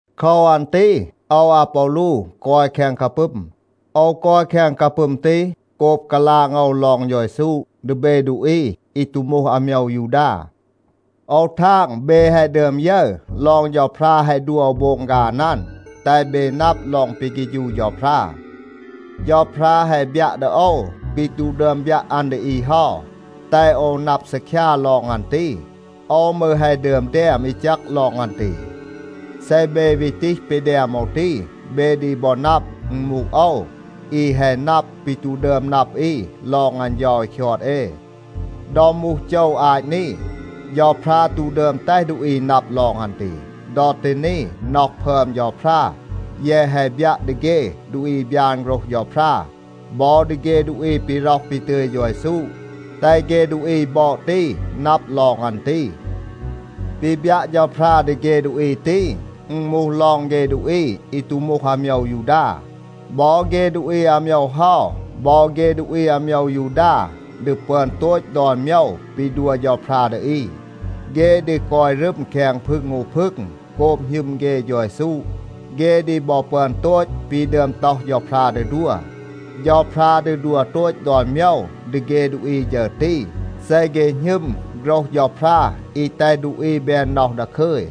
โคว อัน ตี โอว อาปอลู กอย แคง กาปึม. โอว กอย แคง กาปึม ตี โกบ กาลาง โอว ลอง เฌา เยซู ดี เบ ดูอี อี ตู มูห อาโมยว ยูดา. โอว ทาง, เบ แฮะ ดึอม ยึร ลอง เฌาพรา แฮะ ดัว โอว โบง ฆาน อัน, แตห เบ นับ ลอง ปี เฆฌู เฌาพรา. เฌาพรา แฮะ บยัะ ดี โอว ปี ตู ดึอม บยัะ อัน ดี อี เฮา, แตห โอว นับ ซีคยา ลอง อัน ตี. โอว มืร แฮะ ดึอม แดม อี แจก ลอง อัน ตี. เซ เบ วี ตีห ปี แดม โอว ตี, เบ ดี บอ นับ, อึณ มูห โอว, อี แฮะ นับ ปี ตู ดึอม นับ อี ลอง อัน เฌา อี คยอด เอ. ดอ มูห โจว อาต นี, เฌาพรา ตู ดึอม แตห ดูอี นับ ลอง อัน ตี. ดอ ตี นี, น็อห พึอม เฌาพรา แยะ แฮะ บยัะ ดี เฆ ดูอี อี บยาน โฆรห เฌาพรา บอ ดี เฆ ดูอี ปี ร็อห ปี ตึย เฌา เยซู, แตห เฆ ดูอี บอด ตี นับ ลอง อัน ตี. ปี บยัะ เฌาพรา ดี เฆ ดูอี ตี, อึณ มูห ลอง เฆ ดูอี อี ตู มูห อาโมยว ยูดา. บอ เฆ ดูอี อาโมยว เฮา, บอ เฆ ดูอี อาโมยว ยูดา ดี ปึอน โตต ดอน โมยว ปี ดัว เฌาพรา ดี อี. เฆ ดี กอย รึม แคง พึง อู พึง. โกบ หณึม เฆ เฌา เยซู, เฆ ดี บอ ปึอน โตต ปี ดึอม ต็อห เฌาพรา ดี ดัว. เฌาพรา ดี ดัว โตต ดอน โมยว ดี เฆ ดูอี ฌึร ตี, เซ เฆ หณึม โฆรห เฌาพรา อี แตห ดูอี แบน น็อห ดาคึย.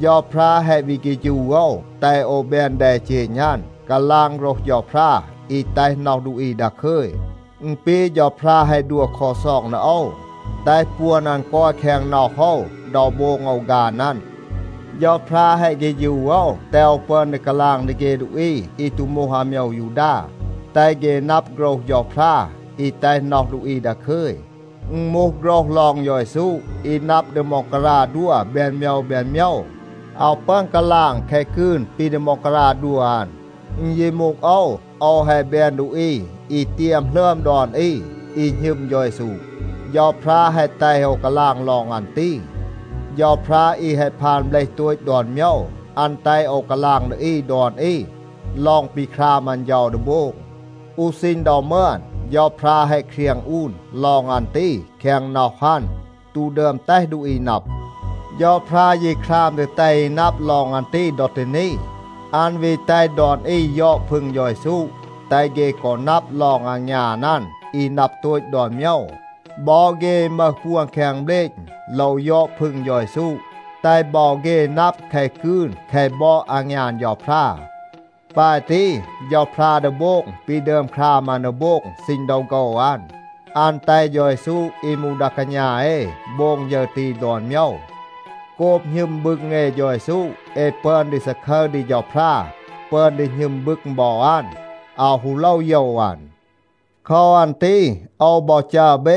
เฌาพรา แฮะ วี เฆฌู โอว, แตห โอว แบน แดเจณ อัน, กาลาง โฆรห เฌาพรา อี แตห น็อห ดูอี ดาคึย. อึณ ปี เฌาพรา แฮะ ดัว ลักซอง ดี โอว, แตห ปวน อัน กอย แคง น็อห โอว ดอ โบง โอว ฆาน อัน. เฌาพรา แฮะ เฆฌู โอว แตห โอว ปึอน ดี กาลาง ดี เฆ ดูอี อี ตู มูห อาโมยว ยูดา, แตห เฆ นับ โฆรห เฌาพรา อี แตห น็อห ดูอี ดาคึย. อึณ มูห โฆรห ลอง เฌา เยซู อี นับ ดี ม็องการา ดัว แบน โมยว แบน โมยว. อาว ปึอน กาลาง แคะ กืน ปี ดี ม็องการา ดัว อัน. อึณ ยี มูห โอว, โอว แฮะ แบน ดูอี อี เตียม หลึอม ดอน อี, อี หณึม เฌา เยซู. เฌาพรา แฮะ แตห โอว กาลาง ลอง อัน ตี. เฌาพรา อี แฮะ พาน เบลห โตต ดอน โมยว, อัน แตห โอว กาลาง ดี อี ดอน อี ลอง ปี คราม อัน เฌา ดี โบง. อู ซีณ ดอ มึอน, เฌาพรา แฮะ เครียง อูน ลอง อัน ตี แคง น็อห อัน, ตู ดึอม แตห ดูอี นับ. เฌาพรา ยี คราม ดี แตห อี นับ ลอง อัน ตี ดอ ตี นี. อัน วี แตห ดอน อี ยอด พึง เฌา เยซู, แตห เฆ กอ นับ ลอง อางยาน อัน อี นับ โตต ดอน โมยว. บอ เฆ อี มึห ปวน แคง เบลณ โลว ยอด พึง เฌา เยซู, แตห บอ เฆ นับ แคะ กืน แคะ บอด อางยาน เฌาพรา. ปาย ตี เฌาพรา ดี โบง ปี ดึอม คราม อัน ดี โบง ซีณ ดอ โฆว อัน. อัน แตห เฌา เยซู อี มูห ดา กาณา เอ โบง ฌึร ตี ดอน โมยว. โกบ หณึม บึง เอ เฌา เยซู, เอ ปึอน ดี ซาคึร ดี เฌาพรา, ปึอน ดี หณึม บึง บอ อัน, อาว ฮู โลว โยว อัน. โคว อัน ตี โอว บอ จัร เบ,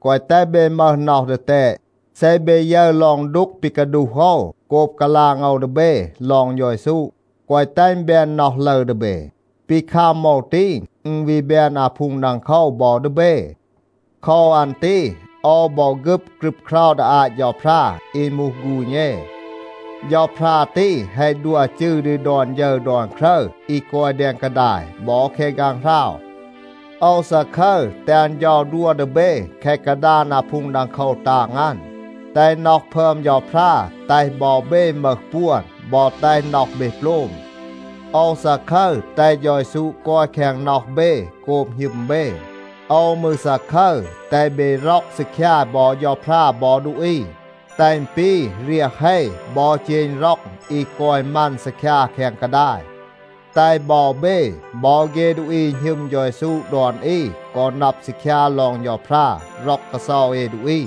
แกวะ แตห เบ มึห น็อห ดีแตด. เซ เบ ยึร ลอง ดูก ปี กาดูห โอว, โกบ กาลาง โอว ดี เบ ลอง เฌา เยซู, แกวะ แตห อึณ แบน น็อห ลึร ดี เบ. ปี คัม โอว ตี, อึณ วี แบน อาพูง ดังโคว บอ ดี เบ. โคว อัน ตี โอว บอ ฆึบ ครึบเครา ดี อาต เฌาพรา อี มูห ฆูณ เอ. เฌาพรา ตี แฮะ ดัว จืร ดี ดอน ฌึร ดอน ครึร อี กอย แดง กาดาย บอ แคง ฆางหราว. โอว ซาคึร, แตห อัน เฌา ดัว ดี เบ แคะ กาดาน อาพูง ดังโคว ตาง อัน. แตห น็อห พึอม เฌาพรา แตห บอ เบ มึห ปวน บอ แตห น็อห เบ โปลม. โอว ซาคึร, แตห เฌา เยซู กอย แคง น็อห เบ โกบ หณึม เบ. โอว มืร ซาคึร, แตห เบ ร็อก ซีคยา บอ เฌาพรา บอ ดูอี, แตห อึณ ปี เรียห เฮ บอ เจณ ร็อง อี กอย มัน ซีคยา แคง กาดาย. แตห บอ เบ บอ เฆ ดูอี อี หณึม เฌา เยซู ดอน อี กอ นับ ซีคยา ลอง เฌาพรา ร็อก กาเซา เอ ดูอี.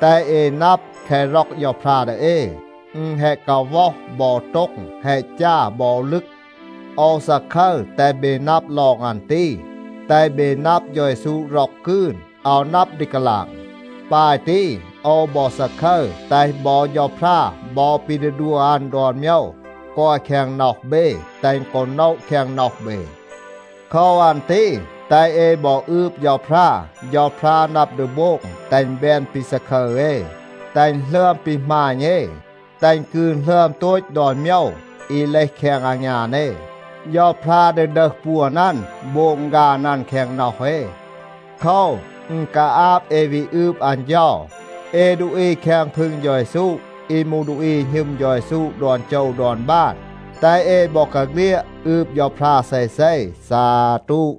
แตห เอ นับ, แคะ ร็อก เฌาพรา ดี เอ, อึณ แฮะ กาว็อห บอ โต็ง, แฮะ จา บอ ลึก. โอว ซาคึร แตห เบ นับ ลอง อัน ตี, แตห เบ นับ เฌา เยซู ร็อก กืน, อาว นับ ดี กาลาง. ปาย ตี โอว บอ ซาคึร, แตห บอ เฌาพรา บอ ปี ดี ดัว อัน ดอน โมยว กอย แคง น็อห เบ, แตห อึณ กอ โนะ แคง น็อห เบ. โคว อัน ตี แตห เอ บอ อืบ เฌาพรา. เฌาพรา นับ ดี โบง แตห อึณ แบน ปี ซาคึร เอ, แตห อึณ หลึอม ปี หมาณ เอ, แตห อึณ กืน หลึอม โตต ดอน โมยว อี เลห แคง อางยาน เอ. เฌาพรา ดี ดึห ปวน อัน โบง ฆาน อัน แคง น็อห เอ. โคว, อึณ กาอาบ เอ วี อืบ อัน เฌา. เอ ดูอี แคง พึง เฌา เยซู อี มูห ดูอี อี หณึม เฌา เยซู ดอน โจว ดอน บาน, แตห เอ บอกาเฆลียด อืบ เฌาพรา เซเซ. ซาตู.